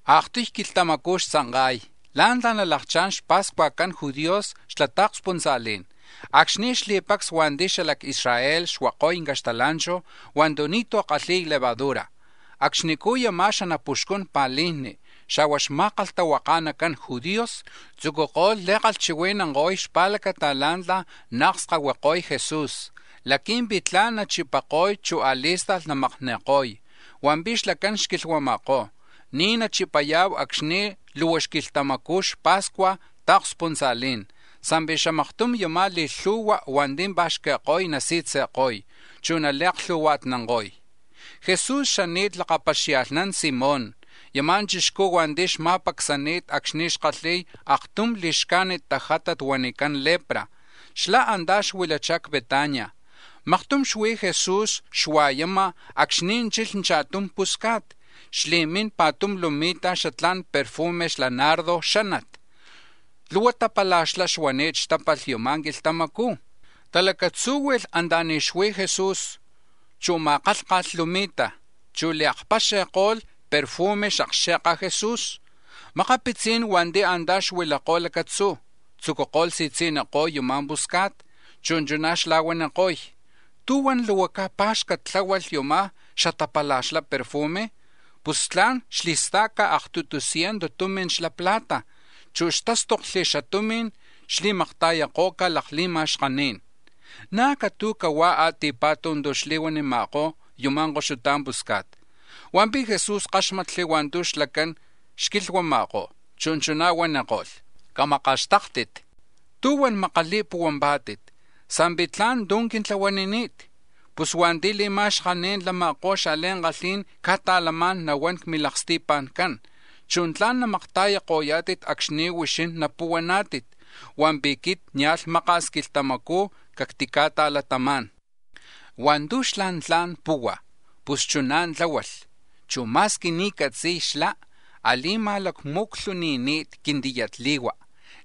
Aaktuy quilhtamacú̱ xtzanka̱y la̱ntla̱ nalakchá̱n xpa̱scuajcan judíos xla ta̱kspuntza̱lí̱n, acxni̱ xli̱pacs hua̱nti̱ xala c-Israel xuako̱y caxtala̱nchu̱ hua̱ntu̱ ni̱tú̱ kalhi̱y levadura. Acxnicú̱ yama̱ xanapuxcun pa̱lijni, xa̱hua̱ xma̱kalhtahuaka̱nacan judíos tzucuko̱lh li̱kalhchihui̱nanko̱y xpa̱lacata la̱ntla̱ naakskahuiko̱y Jesús laqui̱mpi̱ tla̱n nachipako̱y, chu̱ a̱li̱sta̱lh namakni̱ko̱y. Hua̱mpi̱ xlacán xquilhuama̱kó̱: —Ni̱ nachipaya̱hu acxni̱ luhua xquilhtamacu̱ xapa̱scuaj ta̱kspuntza̱lí̱n sa̱mpi̱ xamaktum yama̱ li̱lhu̱hua̱ hua̱nti̱ pa̱xqui̱ko̱y nasi̱tzi̱ko̱y, chu̱ nali̱aklhu̱hua̱tnanko̱y. Jesús xani̱t lakapaxia̱lhnán Simón, yama̱ chixcú̱ hua̱nti̱ xma̱pacsani̱t acxni̱ xkalhi̱y aktum li̱xcajnit tajátat huanicán lepra, xlá̱ antá̱ xuilachá̱ c-Betania. Maktum xuí̱ Jesús xua̱yama̱ acxni̱ chi̱lh cha̱tum pusca̱t, xli̱mín pa̱tum lumi̱ta̱ xatla̱n perfume xla nardo xánat, luhua tapala̱xlá xuani̱t xtápalh yama̱ quilhtamacú̱. Talacatzúhui̱lh anta̱ni̱ xuí̱ Jesús, chu̱ ma̱kálhka̱lh lumi̱ta, chu̱ li̱akpaxi̱ko̱lh perfume c-xakxe̱ka Jesús. Makapitzí̱n hua̱nti̱ antá̱ xuilakó̱ lacatzú̱, tzúculh si̱tzi̱niko̱y yama̱ pusca̱t, chu̱ chuná̱ xla̱huaniko̱y: —Camakaxtáktit. ¿Tú̱huan luhua caj pá̱xcat tláhualh yuma̱ xatapala̱xla perfume? Pus tla̱n xtili̱sta̱ca̱ aktutu ciento tumi̱n xla plata, chu̱ hua̱ntu̱ xtástokli̱ xatumi̱n xtili̱makta̱yako̱ca̱ lakli̱ma̱xkaní̱n. Na̱ catu̱huá̱ a̱ti̱pa̱tu̱ tu̱ xli̱huanima̱kó̱ yuma̱ koxuta pusca̱t. Hua̱mpi̱ Jesús káxmatli̱ hua̱ntu̱ xlacán xquilhuama̱kó̱, chu̱ chuná̱ huaniko̱lh: —¿Tú̱huan makali̱puhuaná̱tit, sa̱mpi̱ tla̱n tu̱ quintlahuanini̱t? Pus hua̱nti̱ li̱ma̱xkaní̱n lama̱kó̱ xa̱li̱ankalhí̱n ca̱ta̱lamá̱n nahuán c-milaksti̱pa̱ncán, chu̱ tla̱n namakta̱yako̱yá̱tit acxni̱ huixín napuhuaná̱tit, hua̱mpi̱ quit nia̱lh maka̱s quilhtamacú̱ cactica̱ta̱latamá̱n. Hua̱ntu̱ xlá̱ tla̱n puhua̱, pus chuná̱ tláhualh, chu̱ ma̱squi ni̱ catzi̱y, xlá̱ a̱li̱ma̱lacmu̱clhuni̱ni̱t quintiyatli̱hua̱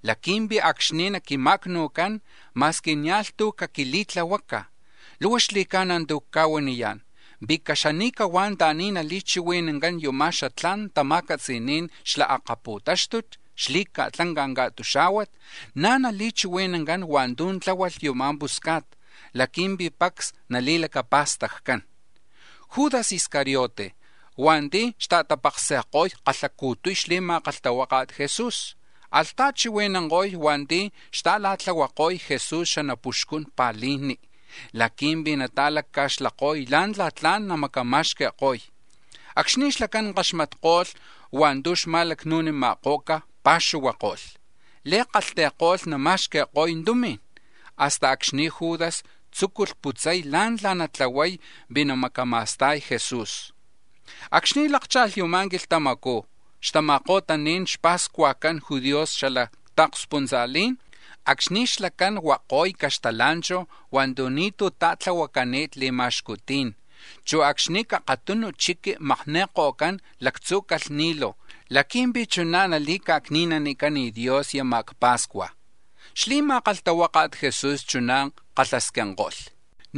laqui̱mpi̱ acxni̱ naquima̱acnu̱cán ma̱squi nia̱lh tú̱ caquili̱tlahuaca̱. Luhua xli̱ca̱na̱ tu̱ cca̱huaniyá̱n, pi̱ caxani̱cahuá̱ anta̱ni̱ natali̱chihui̱nán yuma̱ xatla̱n tama̱catzi̱ní̱n xla akapu̱táxtut xli̱ca̱tlanca̱ ca̱tuxá̱huat, na̱ nali̱chihui̱nancán hua̱ntu̱ tláhualh yuma̱ pusca̱t laqui̱mpi̱ pacs nali̱lacapa̱staccán. Judas Iscariote, hua̱nti̱ xta̱tapaksi̱ko̱y kalhacu̱tuy xli̱ma̱kalhtahuaka̱t Jesús, alh ta̱chihui̱nanko̱y hua̱nti̱ xta̱la̱tlahuako̱y Jesús xanapuxcún pa̱lijni laqui̱mpi̱ nata̱lacca̱xlako̱y la̱ntla̱ tla̱n namacama̱xqui̱ko̱y. Acxni̱ xlacán kaxmatko̱lh hua̱ntu̱ xma̱lacnu̱nima̱ko̱ca̱ pa̱xuhuako̱lh, li̱kalhti̱ko̱lh nama̱xqui̱ko̱y tumi̱n; hasta acxni̱ Judas tzúculh putzay la̱ntla̱ natlahuay pi̱ namacama̱sta̱y Jesús. Acxni̱ lákcha̱lh yama̱ quilhtamacú̱ xtama̱ko̱tani̱n xpa̱scuajcan judíos xla ta̱kspuntza̱lí̱n, acxni̱ xlacán huako̱y caxtala̱nchu̱ hua̱ntu̱ ni̱tú̱ ta̱tlahuacani̱t li̱ma̱xcutí̱n, chu̱ acxni̱ c-akatunu chiqui makni̱ko̱cán lactzu̱ borrego laqui̱mpi̱ chuná̱ nali̱ca̱cni̱nanicán Dios yama̱ c-pa̱scua̱, xli̱ma̱kalhtahuaka̱t Jesús chuná̱ kalhasquinko̱lh: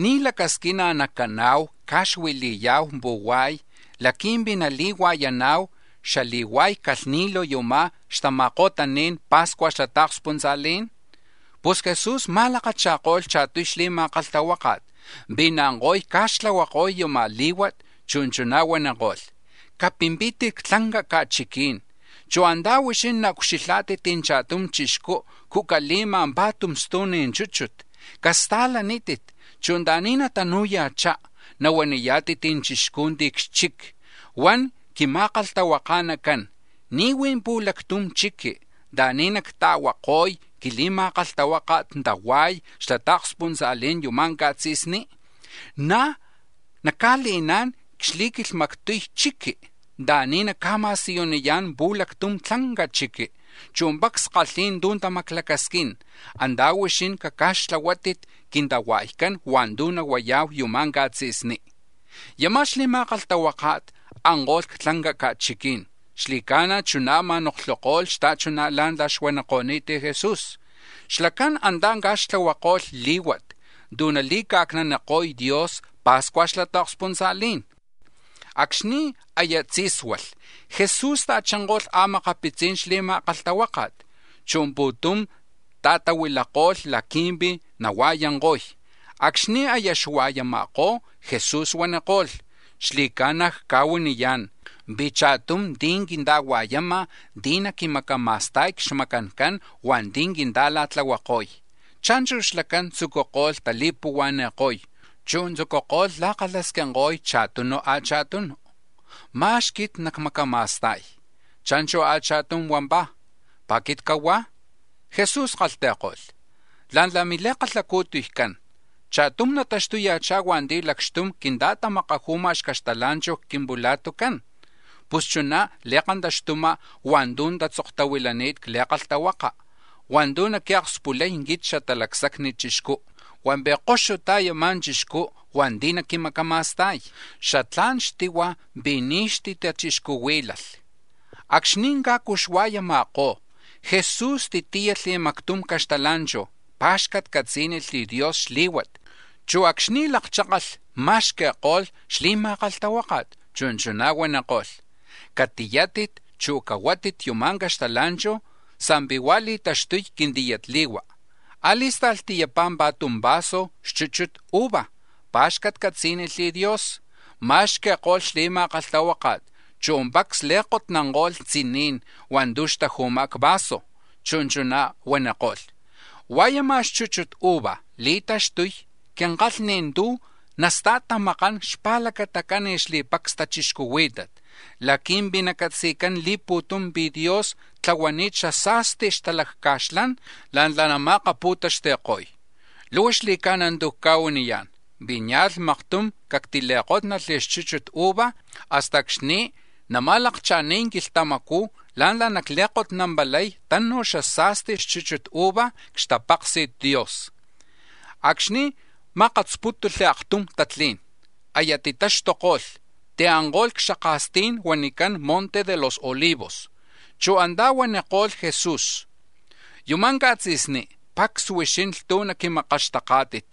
—¿Ní̱ lacasquina̱ nacana̱hu ca̱xuili̱ya̱hu pu̱hua̱y laqui̱mpi̱ nali̱hua̱yana̱hu xali̱hua̱y borrego yuma̱ xtama̱ko̱tani̱n pa̱scua̱ xla ta̱kspuntza̱lí̱n? Pus Jesús ma̱lakacha̱ko̱lh cha̱tuy xli̱ma̱kalhtahuáka̱t pi̱ naanko̱y ca̱xtlahuako̱y yama̱ lí̱huat, chu̱ chuná̱ huaniko̱lh: —Capimpítit c-tlanca ca̱chiquí̱n, chu̱ antá̱ huixín naucxilhá̱tit cha̱tum chixcú̱ cucale̱ma̱ pa̱tum stu̱n chúchut. Casta̱lanítit, chu̱ anta̱ni̱ natanu̱ya̱chá, nahuaniyá̱tit chixcú̱ ti̱ c-xchic: ‘Huan quima̱kalhtahuaka̱nacán: ¿Ní̱ huí̱ pu̱lactum chiqui̱ anta̱ni̱ nacta̱huako̱y quili̱ma̱kalhtahuáka̱t tahua̱y xla ta̱kspuntza̱lí̱n yuma̱ ca̱tzi̱sní?’ Na̱ naca̱le̱ná̱n c-xli̱quilhmactuy chiqui̱ anta̱ni̱ naca̱ma̱siyuniyá̱n pu̱lactum tlanca chiqui, chu̱ pacs kalhi̱y tu̱ tamaclacasquín, antá̱ huixín caca̱xtlahuátit quintahua̱ycán hua̱ntu̱ nahuaya̱hu yuma̱ catzi̱sní. Yama̱ xli̱ma̱kalhtahuáka̱t anko̱lh c-tlanca ca̱chiquí̱n, xli̱ca̱na̱ chuná̱ ma̱noklhuko̱lh xta̱chuná̱ la̱ntla̱ xuaniko̱ni̱t Jesús. Xlacán antá̱ ca̱xtlahuako̱lh lí̱huat tu̱ nali̱ca̱cni̱naniko̱y Dios pa̱scua̱ xla ta̱kspuntza̱lí̱n. Acxni̱ aya tzí̱sualh, Jesús ta̱chinko̱lh a̱makapitzi̱n xli̱ma̱kalhtahuáka̱t, chu̱ pu̱tum ta̱tahuilako̱lh laqui̱mpi̱ nahua̱yanko̱y. Acxni̱ aya xua̱yama̱kó̱ Jesús huaniko̱lh: —Xli̱ca̱na̱ cca̱huaniyá̱n pi̱ cha̱tum ti̱ quinta̱hua̱yama̱ ti̱ naquimacama̱sta̱y c-xmacancan hua̱nti̱ quinta̱la̱tlahuako̱y. Cha̱nchu̱ xlacán tzucuko̱lh tali̱puhua̱ni̱ko̱y, chu̱ tzucuko̱lh la̱kalhasquinko̱y cha̱tunu cha̱tunu: —¿Ma̱x quit nacmacama̱sta̱y? Cha̱nchu̱ a̱cha̱tum huampá̱: —¿Pi̱ quit cahuá̱? Jesús kalhti̱ko̱lh: —La̱ntla̱ mili̱kalhacu̱tuycán, cha̱tum nataxtuya̱chá̱ hua̱nti̱ lakxtum quinta̱tamakaju̱ma̱ xcaxtala̱nchu̱ c-quimpula̱tucán. Pus chuná li̱kantaxtuma̱ hua̱ntu̱ tatzoktahuilani̱t c-Li̱kalhtahuaka̱ hua̱ntu̱ naquiakspulay quit Xatalacsacni Chixcú; hua̱mpi̱ koxutá̱ yama̱ chixcú̱ hua̱nti̱ naquimacama̱sta̱y. ¡Xatlá̱n xtihua̱ pi̱ ni̱ xtitachixcuhuí̱lalh! Acxni̱ cajcu xua̱yama̱kó̱, Jesús tíyalh mactum caxtala̱nchu̱, pa̱xcatcatzí̱nilh Dios xlí̱huat, chu̱ acxni̱ lakchákalh ma̱xqui̱ko̱lh xli̱ma̱kalhtahuáka̱t, chu̱ chuná̱ huaniko̱lh: —Catiyátit, chu̱ cahuátit yuma̱ caxtala̱nchu̱, sa̱mpi̱ huá̱ li̱taxtuy quintiyatli̱hua. A̱li̱sta̱lh tiyapá̱ pa̱tum vaso xchuchut uva, pa̱xcatcatzí̱nilh Dios, ma̱xqui̱ko̱lh xli̱ma̱kalhtahuáka̱t, chu̱ pacs li̱kotnanko̱lh tziní̱n hua̱ntu̱ xtaju̱ma̱ c-vaso. Chu̱ chuná̱ huaniko̱lh: —Hua̱ yuma̱ xchuchut uva li̱taxtuy quinkalhni̱ tu̱ nastajtamakán xpa̱lacatacan xli̱pacs tachixcuhuí̱tat laqui̱mpi̱ nacatzi̱cán li̱pu̱tum pi̱ Dios tlahuani̱t xasa̱sti xtalacca̱xlán la̱ntla̱ nama̱akapu̱taxti̱ko̱y. Luhua xli̱ca̱na̱ tu̱ cca̱huaniyá̱n pi̱ nia̱lh maktum cactili̱kótnalh xchuchut uva hasta acxni̱ nama̱lakcha̱ni̱y quilhtamacú̱ la̱ntla̱ nacli̱kotnampalay tanu̱ xasa̱sti xchuchut uva c-xtapaksi̱t Dios. Acxni̱ makasputko̱lh aktum tatlí̱n, aya titaxtuko̱lh, tianko̱lh c-xaka̱stí̱n huanicán Monte de los Olivos. Chu̱ antá̱ huaniko̱lh Jesús: —Yuma̱ ca̱tzi̱sní, pacs huixín lhtuj naquimakaxtaká̱tit.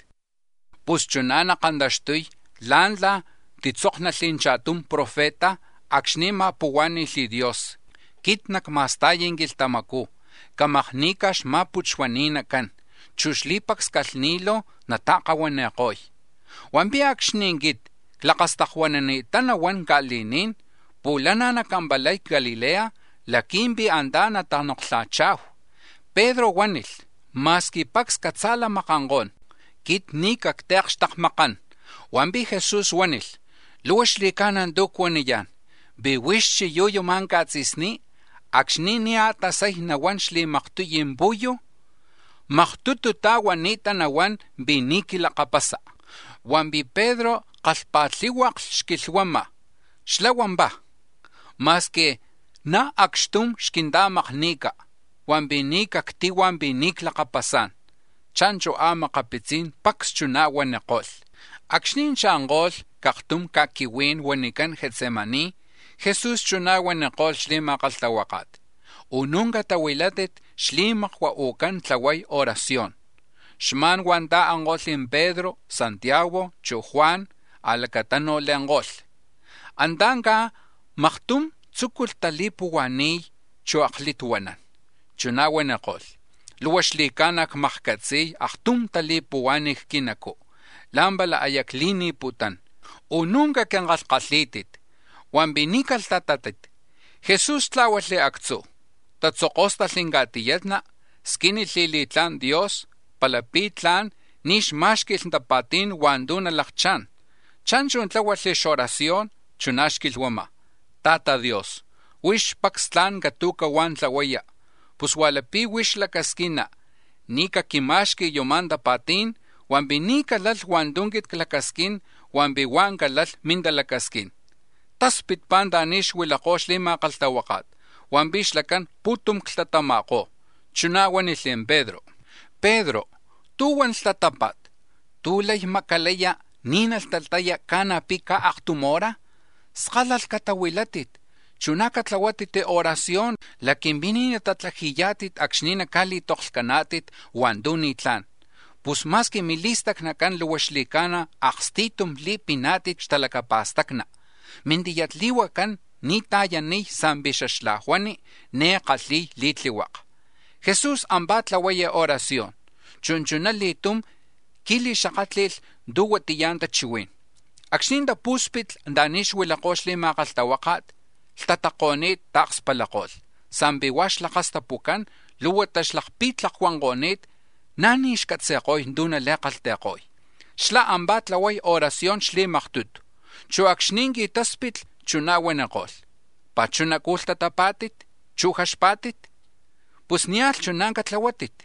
Pus chuná nakantaxtuy la̱ntla̱ titzóknalh cha̱tum profeta acxni̱ ma̱puhuá̱ni̱lh Dios: ‘Quit nacma̱sta̱y quilhtamacú̱ camakni̱ca̱ xma̱putxuani̱nacán, chu̱ xli̱pacs calhni̱lu̱ nata̱kahuani̱ko̱y.’ Hua̱mpi̱ acxni̱ quit clakastakuanani̱ttá nahuán ca̱li̱ní̱n pu̱lana̱ nacampalay c-Galilea laqui̱mpi̱ antá̱ natanoklha̱cha̱hu. Pedro huánilh: —Ma̱squi pacs catza̱lamakankó̱n, quit ni̱ cactiakxtakmakán. Hua̱mpi̱ Jesús huánilh: —Luhua xli̱ca̱na̱ tu̱ cuaniyá̱n, pi̱ huix chiyú̱ yuma̱ ca̱tzi̱sní, acxni̱ ni̱ a̱tasay nahuán xli̱maktuy pu̱yu̱, maktututá̱ huani̱ta nahuán pi̱ ni̱ quilakapasa. Hua̱mpi̱ Pedro kalhpa̱tlihuaklh xquilhuama̱ xlá̱ huampá̱: —Ma̱squi na̱ acxtum xquinta̱makni̱ca̱ hua̱mpi̱ ni̱ cactihua̱ pi̱ ni̱ clakapasá̱n. Cha̱nchu̱ a̱makapitzí̱n pacs chuná̱ huaniko̱lh. Acxni̱ cha̱nko̱lh c-aktum ca̱quihuí̱n huanicán Getsemaní, Jesús chuná̱ huaniko̱lh xli̱ma̱kalhtahuáka̱t: —Unú̱ catahuilaká̱tit xli̱makua u̱cán tlahuay oración. Xma̱n huá̱ ta̱anko̱lh Pedro, Santiago, chu̱ Juan, a̱lacatanu̱ le̱nko̱lh. Antá̱ cajmaktum tzúculh tali̱puhua̱ni̱y, chu̱ aklituanán. Chuná̱ huaniko̱lh: —Luhua xli̱ca̱na̱ cmakcatzi̱y aktum tali̱puhuá̱n c-quinacú̱, la̱mpala aya cli̱ni̱putún. Unú̱ caquinkalhkalhí̱tit, hua̱mpi̱ ni̱ calhtatátit. Jesús tlá̱hualh actzú̱, tatzokóstalh ca̱tiyatna, squínilh li̱tlá̱n Dios palapi̱ tla̱n ni̱ xmá̱xqui̱lh tapa̱tí̱n hua̱ntu̱ nalakchá̱n. Cha̱nchu̱ tláhualh xoracion, chuná̱ xquilhuama̱: —Ta̱ta̱ Dios, huix pacs tla̱n catu̱cahuá̱ tlahuaya, pus hua̱ lapi̱ huix lacasquina, ni̱ caquima̱xqui̱ yuma̱ tapa̱tí̱n, hua̱mpi̱ ni̱ calalh hua̱ntu̱ quit clacasquín hua̱mpi̱ huá̱ calalh mintalacasquín. Taspitpá̱ anta̱ni̱ xuilakó̱ xli̱ma̱kalhtahuáka̱t, hua̱mpi̱ xlacán pu̱tum clhtatama̱kó̱. Chuná̱ huánilh Pedro: —Pedro, ¿tú̱huan lhtatápa̱t? ¿Tú̱ lay macalaya̱ ni̱ nalhtataya̱ ca̱na̱ pi̱ caj aktum hora? Skálalh catahuilátit; chu̱ na̱ catlahuátit oración laqui̱mpi̱ ni̱ natatlaji̱yá̱tit acxni̱ naca̱li̱toklhcaná̱tit hua̱ntu̱ ni̱tlá̱n. Pus ma̱squi mili̱stacnacán luhua xli̱ca̱na̱ aksti̱tum li̱piná̱tit xtalacapa̱stacni, mintiyatli̱huacán ni̱ ta̱yaniy sa̱mpi̱ xaxlajuani, ni̱ kalhi̱y li̱tlihuaka. Jesús ampá̱ tlahuay oración, chu̱ chuná li̱tum qui̱li̱xakátli̱lh tu̱ huatiya̱ tachihuí̱n. Acxni̱ tapú̱spitli̱ anta̱ni̱ xuilakó̱ xli̱ma̱kalhtahuáka̱t, lhtatako̱ni̱t ta̱kspalako̱lh, sa̱mpi̱ hua̱ xlakastapucán, luhuata xlakpi̱tlakuanko̱ni̱t, na̱ ni̱ xcatzi̱ko̱y tu̱ nali̱kalhti̱ko̱y. Xlá̱ ampá̱ tlahuay oración xli̱maktutu, chu̱ acxni̱ qui̱táspitli, chuná̱ huaniko̱lh: —¿Pá̱ chunacú̱ lhtatapá̱tit, chu̱ jaxpá̱tit? Pus nia̱lh chuná̱ catlahuátit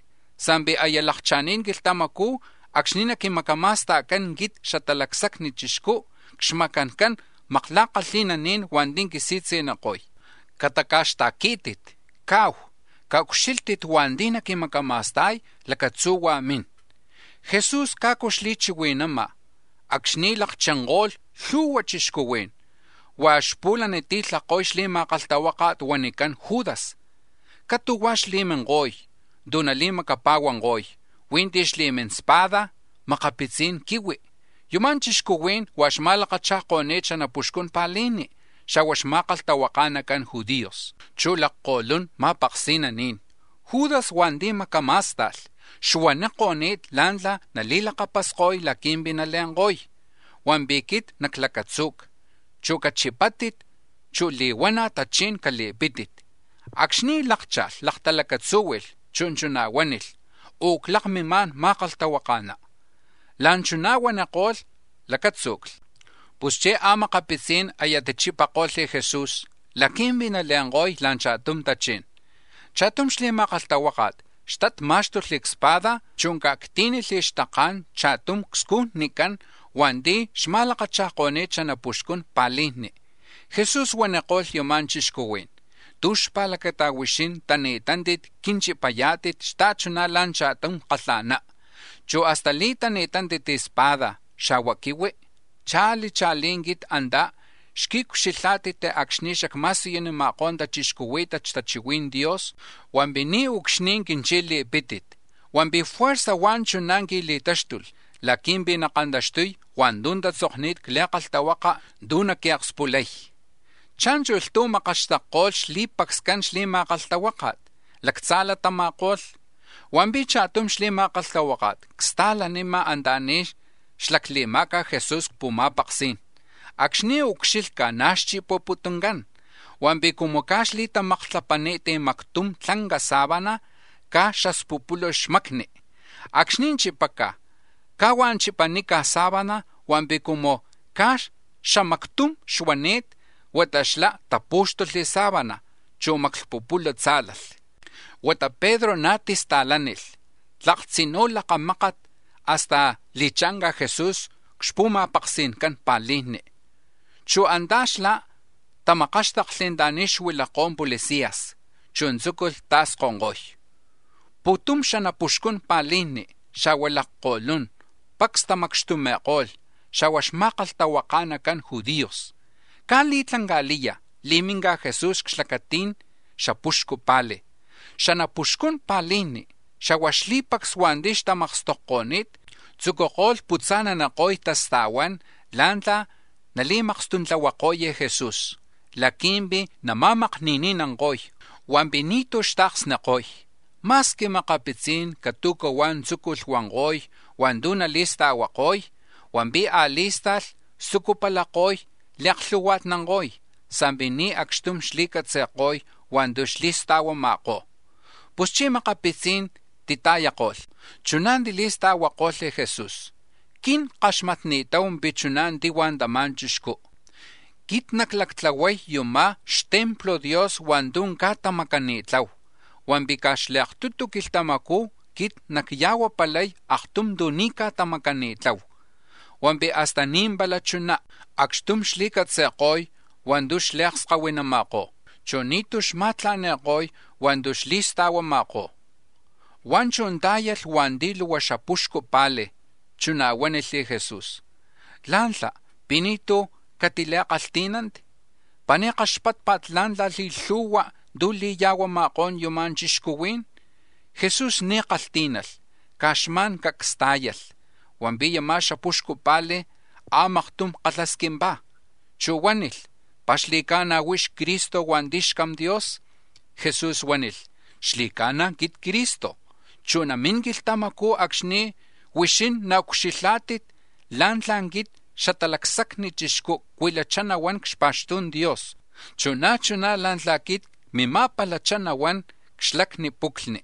sa̱mpi̱ aya lakcha̱ni̱t quilhtamacú̱ acxni̱ naquimacama̱sta̱cán quit Xatalacsacni Chixcú̱ c-xmacancan makla̱kalhi̱naní̱n hua̱nti̱ quisi̱tzi̱niko̱y. Cataca̱xta̱quí̱tit; caahu. Caucxílhtit, hua̱nti̱ naquimacama̱sta̱y; lacatzuhuá̱ mín. Jesús cajcu xchihui̱nama̱ acxni̱ lakchinko̱lh lhu̱hua chixcuhuí̱n, huá̱ xpu̱laniti̱lhako̱y xli̱ma̱kalhtahuáka̱t huanicán Judas. Catu̱huá̱ xli̱minko̱y tu̱ nali̱macapa̱huanko̱y, huí̱ ti̱ xli̱mín espada, makapitzí̱n quihui. Yuma̱ chixcuhuí̱n huá̱ xma̱lakacha̱ko̱ni̱t xanapuxcun pa̱lijni, xa̱hua̱ xma̱kalhtahuaka̱nacan judíos, chu̱ lakko̱lun ma̱paksi̱naní̱n. Judas hua̱nti̱ macamá̱sta̱lh xuaniko̱ni̱t la̱ntla̱ nali̱lakapasko̱y laqui̱mpi̱ nale̱nko̱y: “Hua̱nti̱ quit naclacatzu̱ca, huá̱ cachipátit, chu̱ li̱huana̱ tachí̱n cali̱pítit.” Acxni̱ lákcha̱lh, laktalacatzúhui̱lh, chu̱ chuná̱ huánilh: —Uclakmimá̱n, ma̱kalhtahuaka̱ná. La̱nchuná̱ huaniko̱lh, lacátzu̱cli. Puschí̱ a̱makapitzí̱n aya tichipako̱lh Jesús laqui̱mpi̱ nale̱nko̱y la̱ cha̱tum tachí̱n. Cha̱tum xli̱ma̱kalhtahuáka̱t xtat má̱xtulh cspada, chu̱ ca̱actí̱nilh xtaké̱n cha̱tum cscujnicán hua̱nti̱ xma̱lakacha̱ko̱ni̱t xanapuxcun pa̱lijni. Jesús huaniko̱lh yama̱ chixcuhuí̱n: —¿Tú̱ xpa̱lacata huixín tani̱tántit quinchipayá̱tit xta̱chuná̱ la̱ cha̱tum kalha̱ná, chu̱ hasta li̱tani̱tántit spada̱, xa̱hua̱ quihui? Cha̱li̱ cha̱lí̱ quit antá̱ xquiucxilhá̱tit acxni̱ xacma̱siyunima̱kó̱ tachixcuhuí̱tat xtachihui̱n Dios, hua̱mpi̱ niucxni̱ quinchi̱li̱pítit; hua̱mpi̱ juerza̱ huá̱ chuná̱ qui̱li̱táxtulh laqui̱mpi̱ nakantaxtuy hua̱ntu̱ tatzokni̱t c-Li̱kalhtahuaka̱ tu̱ naquiakspulay. Cha̱nchu̱ lhtuj makaxtakko̱lh xli̱pacscan xli̱ma̱kalhtahuáka̱t, lactza̱latama̱ko̱lh. Hua̱mpi̱ cha̱tum xli̱ma̱kalhtahuáka̱t csta̱lanima̱ anta̱ni̱ xlacle̱ma̱ca̱ Jesús c-pu̱ma̱paksí̱n; acxni̱ ucxilhca̱, na̱ xchipaputuncán. Hua̱mpi̱ cumu caj xli̱tamaktlapani̱t mactum tlanca sábana, caj xaspupulu xmacni, acxni̱ chipaca̱, caj huá̱ chipanica̱ sábana, hua̱mpi̱ cumu caj xamactum xuani̱t, huata xlá̱ tapú̱xtulh xsábana, chu̱ xamaklhpupulu̱ tzá̱lalh. Huata Pedro na̱ tista̱lánilh tlak tzinú̱ lakamákat hasta li̱cha̱nca̱ Jesús c-xpu̱ma̱paksi̱ncan pa̱lijni, chu̱ antá̱ xlá̱ tamakáxtakli̱ anta̱ni̱ xuilakó̱ policías, chu̱ tzúculh ta̱skonko̱y. Pu̱tum xanapuxcun pa̱lijni, xa̱hua̱ lakko̱lún, pacs tamacxtumi̱ko̱lh, xa̱hua̱ xma̱kalhtahuaka̱nacan judíos. Caj li̱tlanca̱liya̱ li̱minca̱ Jesús c-xlacati̱n xapuxcu pa̱li̱. Xanapuxcun pa̱lijni, xa̱hua̱ xli̱pacs hua̱nti̱ xtamakstokko̱ni̱t, tzucuko̱lh putza̱naniko̱y tasta̱huán la̱ntla̱ nali̱makstuntlahuako̱y Jesús laqui̱mpi̱ nama̱makni̱ni̱nanko̱y, hua̱mpi̱ ni̱tú̱ xta̱ksniko̱y. Ma̱squi makapitzí̱n catu̱cahuá̱ tzúculh huanko̱y hua̱ntu̱ nali̱sta̱huako̱y, hua̱mpi̱ a̱li̱sta̱lh xtzucupalako̱y li̱aklhu̱hua̱tnanko̱y, sa̱mpi̱ ni̱ acxtum xli̱catzi̱ko̱y hua̱ntu̱ xli̱sta̱huama̱kó̱. Puschí̱ makapitzí̱n tita̱yako̱lh, chuná̱ tili̱sta̱huakolh Jesús: —Quin ckaxmatni̱tahu pi̱ chuná̱ tihua̱ tama̱ chixcú: ‘Quit naclactlahuay yuma̱ xtemplo̱ Dios hua̱ntu̱ caj tamacani̱tlahu hua̱mpi̱ caj xli̱aktutu quilhtamacú̱ quit nacya̱huapalay aktum tu̱ ni̱ caj tamacani̱tlahu.’ Hua̱mpi̱ hasta ni̱ pala chuná acxtum xli̱catzi̱ko̱y hua̱ntu̱ xli̱aksani̱nama̱kó̱, chu̱ ni̱tú̱ xma̱tla̱ni̱ko̱y hua̱ntu̱ xli̱sta̱huama̱kó̱. Huá̱ chú̱ tá̱yalh hua̱nti̱ luhua xapuxcu pa̱li̱, chuná̱ huánilh Jesús: —¿Lá̱ntla̱ pi̱ ni̱tú̱ catili̱kalhtí̱nanti? ¿Pi̱ ni̱ kaxpátpa̱t la̱ntla̱ li̱lhu̱hua̱ tu̱ li̱ya̱huama̱kó̱n yuma̱ chixcuhuí̱n? Jesús ni̱tú̱ kalhtí̱nalh, caj xma̱n cacs tá̱yalh. Hua̱mpi̱ yama̱ xapuxcu pa̱li̱ a̱maktum kalhasquimpá̱, chu̱ huánilh: —¿Pi̱ xli̱ca̱na̱ huix Cristo hua̱nti̱ xCam Dios? Jesús huánilh: —Xli̱ca̱na̱ quit Cristo. Chu̱ namín quilhtamacú̱ acxni̱ huixín naucxilhá̱tit la̱ntla̱ quit Xatalacsacni Chixcú̱ cuilachá nahuán c-xpa̱xtu̱n Dios, chu̱ na̱ chuná̱ la̱ntla̱ quit cmima̱palachá nahuán c-xlacni puclhni.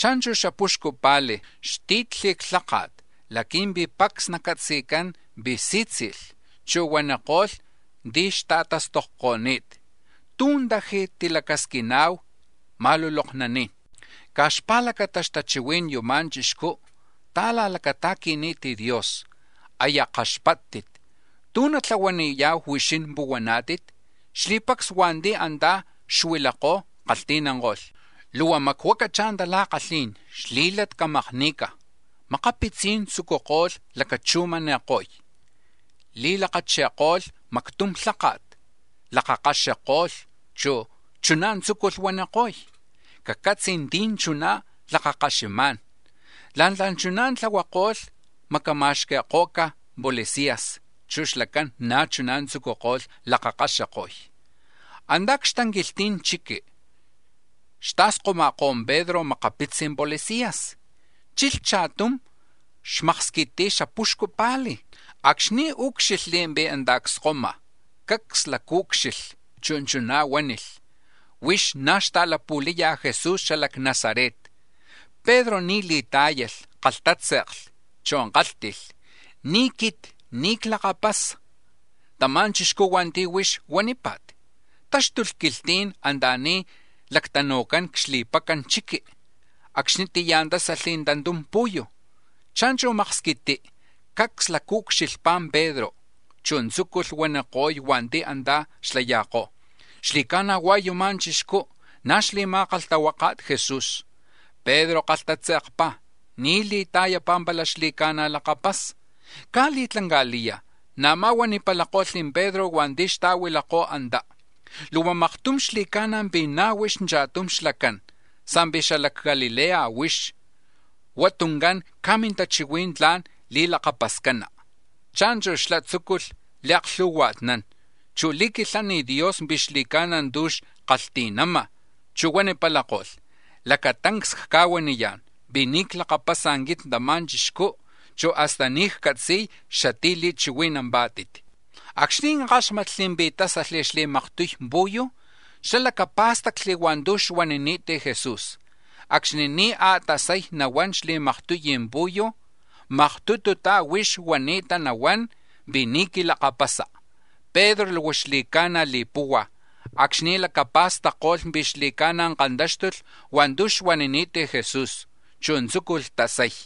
Cha̱nchu̱ xapuxcu pa̱li̱, xti̱tli̱ xlháka̱t laqui̱mpi̱ pacs nacatzi̱cán pi̱ sí̱tzi̱lh, chu̱ huaniko̱lh ti̱ xta̱tastokko̱ni̱t: —¿Tú̱ taji̱ tili̱lacasquina̱hu ma̱luloknaní̱n? Caj xpa̱lacata xtachihuí̱n yuma̱ chixcú ta̱la̱lacata̱qui̱ni̱t Dios, aya kaxpáttit. ¿Tú̱ natlahuaniya̱hu, huixín puhuaná̱tit? Xli̱pacs hua̱nti̱ antá̱ xuilakó̱ kalhti̱nanko̱lh: —¡Luhua macuacachá̱ tala̱kalhí̱n, xlí̱lat camakni̱ca̱! Makapitzí̱n tzucuko̱lh lacachujmani̱ko̱y, li̱lakachi̱ko̱lh mactum lháka̱t, lakakaxiko̱lh, chu̱ chuná̱ tzúculh huaniko̱y: —Cacatzi, ¿tí̱ chuná̱ lakakaxima̱n? La̱ntla̱ chuná̱ tlahuako̱lh macama̱xqui̱ko̱ca̱ policías, chu̱ xlacán na̱ chuná̱ tzucuko̱lh lakakaxiko̱y. Anta̱ni̱ c-xtanquilhti̱n chiqui̱ xta̱skoma̱kó̱ Pedro makapitzi policías, chilh cha̱tum xmaksquiti xapuxcu pa̱li̱. Acxni̱ úcxilhli̱ pi̱ antá̱ cskoma̱, cacs lacaúcxilhli, chu̱ chuná̱ huánilh: —Huix na̱ xta̱lapu̱laya̱ Jesús xala c-Nazaret. Pedro ni̱ li̱tá̱yalh, kalhtátze̱kli, chu̱ kálhti̱lh: —Ni̱ quit, ni̱ clakapasa̱ tama̱ chixcú̱ hua̱nti̱ huix huanípa̱t. Táxtulh quilhtí̱n anta̱ni̱ lactanu̱cán c-xli̱pacan chiqui, acxnitiyá̱ tásalh tantum pu̱yu̱. Cha̱nchu̱ maksquití, cacs lacaucxilhpá̱ Pedro, chu̱ tzúculh huaniko̱y hua̱nti̱ antá̱ xlaya̱kó̱: —Xli̱ca̱na̱ hua̱ yuma̱ chixcú̱ na̱ xli̱ma̱kalhtahuaka̱t Jesús. Pedro kalhtatze̱kpá̱, ni̱ li̱ta̱yapá̱ pala xli̱ca̱na̱ lakapasa. Caj li̱tlanca̱liya̱, na̱má̱ huanipalako̱lh Pedro hua̱nti̱ xta̱huilakó̱ antá: —Luhua maktum xli̱ca̱na̱ pi̱ na̱ huix cha̱tum xlacán, sa̱mpi̱ xala c-Galilea huix, hua tuncán caj mintachihuí̱n tla̱n li̱lakapascana. Cha̱nchu̱ xlá̱ tzúculh li̱aklhu̱hua̱tnán, chu̱ li̱quilhán Dios pi̱ xli̱ca̱na̱ tu̱ xkalhti̱nama̱, chu̱ huanipalako̱lh: —Lacatancs cca̱huaniyá̱n pi̱ ni̱ clakapasa̱ quit tama̱ chixcú, chu̱ hasta ni̱ ccatzi̱y xatí̱ li̱chihui̱nampá̱tit. Acxni̱ káxmatli̱ pi̱ tásalh xli̱maktuy pu̱yu̱, xlá̱ lacapá̱stacli̱ hua̱ntu̱ xuanini̱t Jesús: “Acxni̱ ni̱ a̱tasay nahuán xli̱maktuy pu̱yu̱, huix maktututá̱ huani̱ta nahuán pi̱ ni̱ quilakapasa.” Pedro luhua xli̱ca̱na̱ li̱puhua̱ acxni̱ lacapa̱stacko̱lh pi̱ xli̱ca̱na̱ kantáxtulh hua̱ntu̱ xuanini̱t Jesús, chu̱ tzúculh tasay.